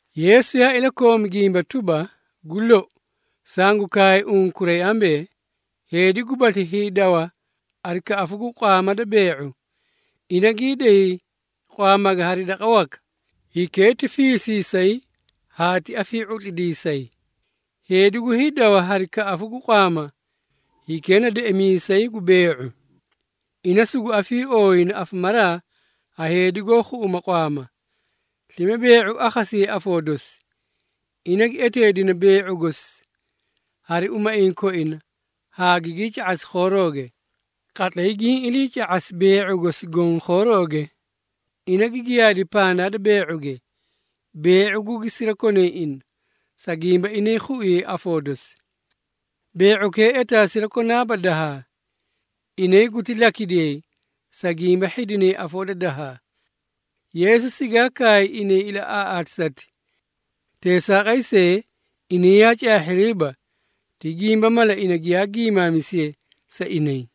Yeesu yaa ilakoomi gimba tuba, “Gu lou, sangu kaay unkuray ambee, heedi gubasli hiidawa hari kaꞌafu gu qwaama da bee⁄u, ina gii day qwaamage hari daqa waka, hikee ti fiisiisay haa ti afii⁄utlidiisayi. Heedi gu hiidawa hari kaꞌafu gu qwaama, hikee na deꞌemiisay gu bee⁄u. Ina sugu afiiooyina afamaraa ha heedi goó ga⁄awa qwaama, slime bee⁄u akhasiyayi afoo dosi. Ina gi eteedina bee⁄u gosi hari umaiĩ koina haa gigii ca⁄asi khoorooge. Qatlay giĩ iliica⁄asi bee⁄u gosi goõ khoorooge, ina gi giyaadi pandaa da bee⁄uge, bee⁄u gugi sirakonay ina, sa gimba inay khuiyay afoo dosi. Bee⁄ukee etaa sirakonaaba dahaa. Inay guti lakidiyay, sa gimba hhidinay afoo da dahaa.” Yeesu sigaa kaay inay ilaꞌaaꞌaatisati. Teesaaqay see, inay yaa caahhiriiba, ti gimba mala ina giyaa giimaamisiye sa inay.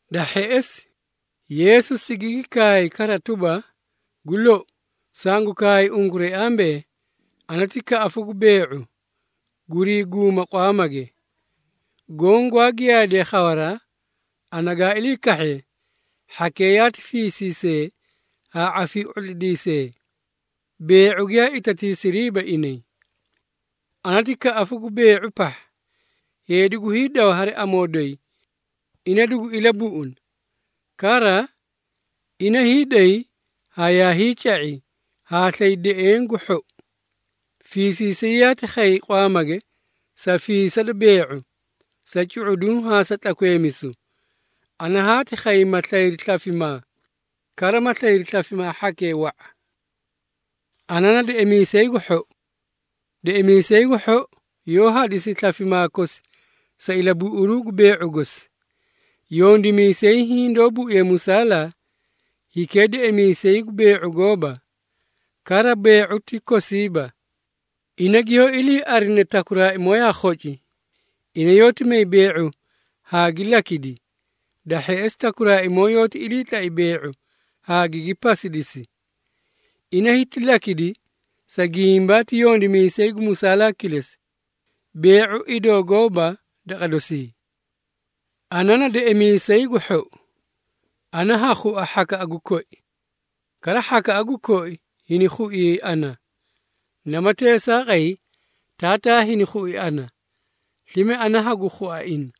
Da hheꞌesi, Yeesu sigigi kaay kara tuba, “Gu lou, sangu kaay unkuray ambee, ana ti kaꞌafu gu bee⁄u, gurii guuma qwaamage. Goõ gwaa giyaadee khawaraa, ana gaa ilii kahhe, hhakee yaati fiisiisee haa afii⁄utlidiisee, bee⁄u giyaa itatiisiriiba inay. Ana ti kaꞌafu gu bee⁄u pahha. Heedi gu hiidawa hari amoo doyi, ina dugu ilabuꞌuna. Kara, ina hiiday haa yaa hiica⁄i, haa slay deꞌeẽ gu hhou. Fiisiisay yaati khay qwaamage sa fiisi da bee⁄u, sa cu⁄uduũ haa sa tlakweemisu. Ana haati khay ma slayri slafimaa, kara ma slayri slafimaa hhakee wa⁄a. Ana na deꞌemiisay gu hhou. Deꞌemiisay gu hhou yoó hadisi slafimaa kosi sa ilabuꞌuru gu bee⁄u gosi. Yondimiisay hiĩ doó buiye musaalaa, hikee deꞌemiisay gu bee⁄u gooba, kara bee⁄u ti kosiiba. Ina giyoó iliiarine takuraaimoo yaa khoci, ina yoóti may bee⁄u haa gi lakidi. Da hheꞌesi, takuraaimoo yoóti iliitlai bee⁄u haa gigii pasidisi. Ina hiti lakidi, sa gimba ti yondimiisay gu musaalaa kilesi, bee⁄u idoo gooba daqa dosii. Ana na deꞌemiisay gu hhou. Ana ha khua hhakaꞌa gu koi, kara hhakaꞌa gu koi hini khuiyay ana. Namati teesaaqay Taataa hini khui ana, slime ana hagu khua ina.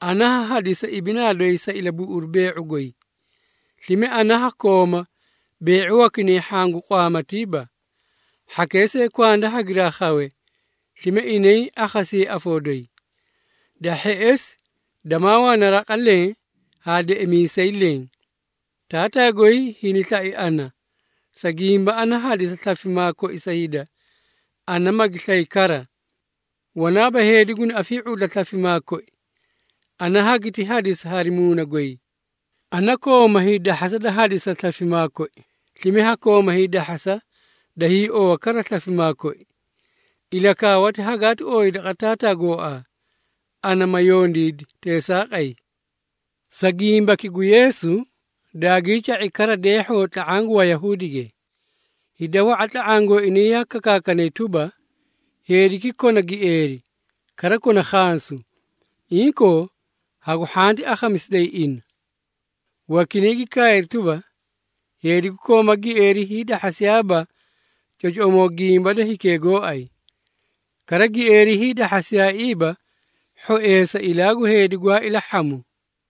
Ana ha hadisa ibinaa doyi sa ilabuꞌuru bee⁄u goy. Slime ana ha kooma bee⁄u wakinay hhaã gu qwaamatiiba. Hhakee see kwanda hagiraa khawe, slime inay akhasiyayi afoo doyi. Da hheꞌesi, damaa wana raqa leẽ haa deꞌemiisay leẽ. Taataa goy hini slai ana, sa gimba ana hadisa slafimaa koi sa hida, ana magi slay kara. Wanaaba heedi guni afii⁄utla slafimaa koi, ana hagiti hadisa hari muuna goy. Ana kooma hiidahhasa da hadisa slafimaa koi, slime ha kooma hiidahhasa da hiiowa kara slafimaa koi. Ilakaawati hagaati ooyi daqa Taataa gooaa, ana ma yondiidi teesaaqay.” Sa gimbaki gu Yeesu, daagii ca⁄i kara deehhoo tla⁄aã gu Wayahuudige. Hida wa⁄a tla⁄aã gooinay yaa kakaakanay tuba, “Heediki kona gieeri, kara kona khansu! Inkoo, hagu hhanti akhamisidayi ina!” Wakinay gi kaayri tuba, “Heedi gu kooma gieeri, hiidahhasiyaaba cocoꞌomoo gimba da hikee gooay. Kara, gieeri hiidahhasiyaaiiba hhoeesa ilaa gu heedi gwaa ilahhamu.”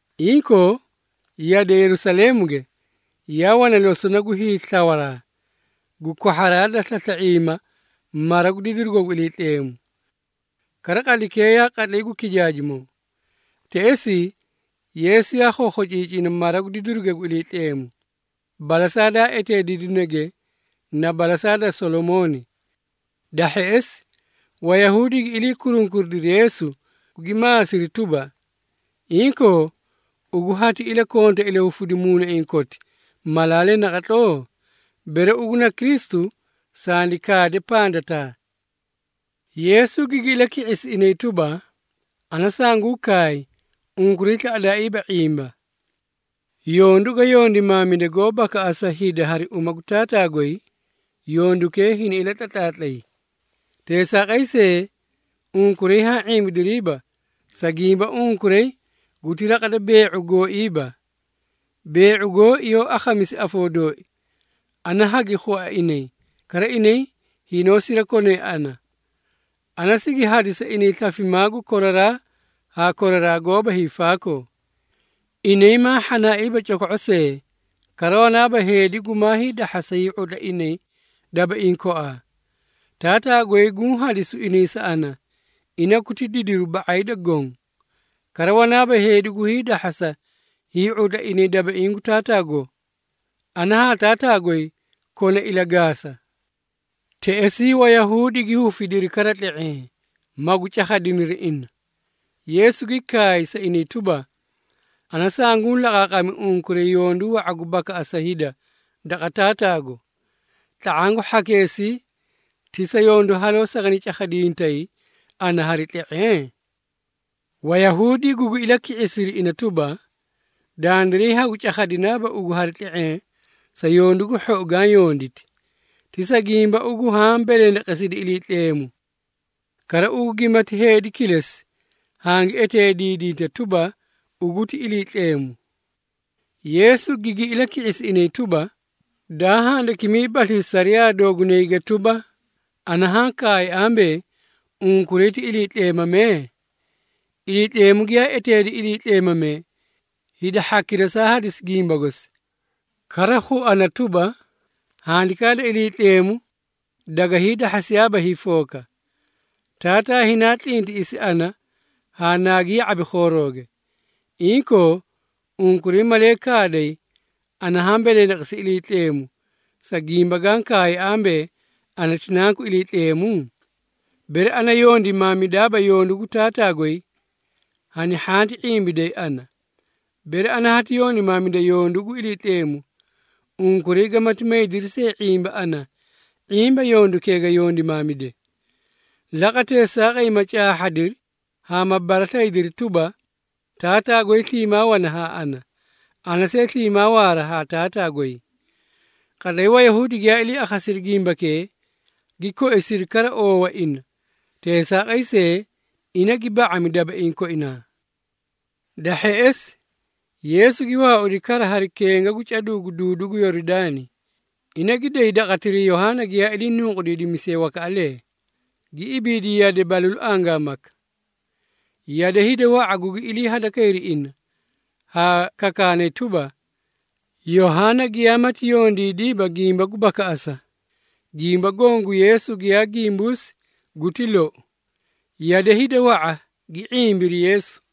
Inkoo, yade Yerusaleemuge yaa wana losona gu hiislawaraa gu kwahharaa da slasla⁄iima mara gu didirugo gu Iliitleemu. Kara, qatlaykee yaa qatlay gu kijaajimoo. Teꞌesii, Yeesu yaa khokhociicina mara gu didiruge gu Iliitleemu, balasaa daa eteediidinege na balasaa da Solomooni. Da hheꞌesi, Wayahuudi gi ilii kurunkuridiri Yeesu, gugi maasiri tuba, “Inkoo, ugu hati ilakonta ilahufita muunaiĩ koti malaalee naqatloo? Bere ugu na Kristu, sandi kaade pandataa.” Yeesu gigi ilaki⁄isi inay tuba, “Ana sanguũ kaay, unkuray slaꞌadaaiiba ⁄imba. Yondu ga yondimaamide goó bakaꞌasa hida hari uma gu Taataa goy, yondukee hini ilatlatlaatlay. Teesaaqay see, unkuray haã ⁄imbidiriiba, sa gimba unkuray guti raqa da bee⁄u gooiiba. Bee⁄u gooi yoó akhamisi afoo dooi, ana hagi khua inay, kara inay hinoó sirakonay ana. Ana sigi hadisa inay slafimaa gu koraraa haa koraraa goóba hiifaakoo. Inay maa hhanaaiiba coko⁄o see, kara wanaaba heedi gumaa hiidahhasa hii⁄utla inay dabaiĩ koaa. Taataa goy guũ hadisu inay sa ana, ina guti didiru ba⁄ay da goõ. Kara, wanaaba heedi gu hiidahhasa hii⁄utla inay dabaiĩ gu Taataago. Ana haa Taataa goy kona ilagaasa.” Teꞌesii Wayahuudi gi hufidiri kara tle⁄eẽ, magu cakhadiniri ina. Yeesu gi kaay sa inay tuba, “Ana sunguũ laqaaqami unkuray yondu wa⁄a gu bakaꞌasa hida daqa Taataago. Tla⁄aã gu hhakeesii ti sa yondu haloo sagani cakhadintay ana hari tle⁄eẽ?” Wayahuudi gugi ilaki⁄isiri ina tuba, “Dandiray hagu cakhadinaaba ugu hari tle⁄eẽ sa yondu gu hhou gaã yonditi, ti sa gimba ugu haã belendeqesidi Iliitleemu. Kara ugu gimati heedi kilesi, hangi eteediidinta tuba, ugu ti Iliitleemu.” Yeesu gigi ilaki⁄isi inay tuba, “Daa handakimiibaslii sariyaa doogunayge tuba, ‘Ana haã kaay ambee, unkuray ti iliitleemamee?’ Iliitleemu giyaa eteedi iliitleemamee, hida hhakira saa hadisi gimba gosi. Kara, khuana tuba, Handikaa da Iliitleemu daga hiidahhasiyaaba hiifooka. Taataa hinaa tlintiꞌisi ana haa naagi ya⁄abi khoorooge. Inkoo, unkuray malee kaaday, ana haã belendeqesi Iliitleemu, sa gimba gaã kaay ambee, ‘Ana ti Nanku Iliitleemu?’ Bere ana yondimaamidaaba yondu gu Taataa goy, hani hhanti ⁄imbiday ana. Bere ana hati yondimaamida yondu gu Iliitleemu, unkuray gamati maydiri see ⁄imba ana, ⁄imba yondukee ga yondimaamide. Laqa teesaaqay ma caahhadiri haa ma baraslayidiri tuba, Taataa goy sliimaa wana haa ana, ana see sliimaa waara haa Taataa goy.” Qatlay Wayahuudi giyaa ilii akhasiri gimbakee, gi koisiri kara oowa ina, teesaaqay see, ina gi ba⁄ami dabaiĩ koinaa. Da hheꞌesi, Yeesu gi waaudi kara hari kenga gu caduu gu duudu gu Yoridaani. Ina, gi day daqatiray Yohaana giyaa ilii nunqudiidimisiye wakaꞌalee, gi ibiidi yade balalu angaamaka. Yade, hida wa⁄a gugi ilii hadakayri ina, haa kakaanay tuba, “Yohaana giyaamati yondiidiiba gimba gu bakaꞌasa, gimba goõ gu Yeesu, giyaa gimbuusi guti lou.” Yade hida wa⁄a gi ⁄imbiri Yeesu.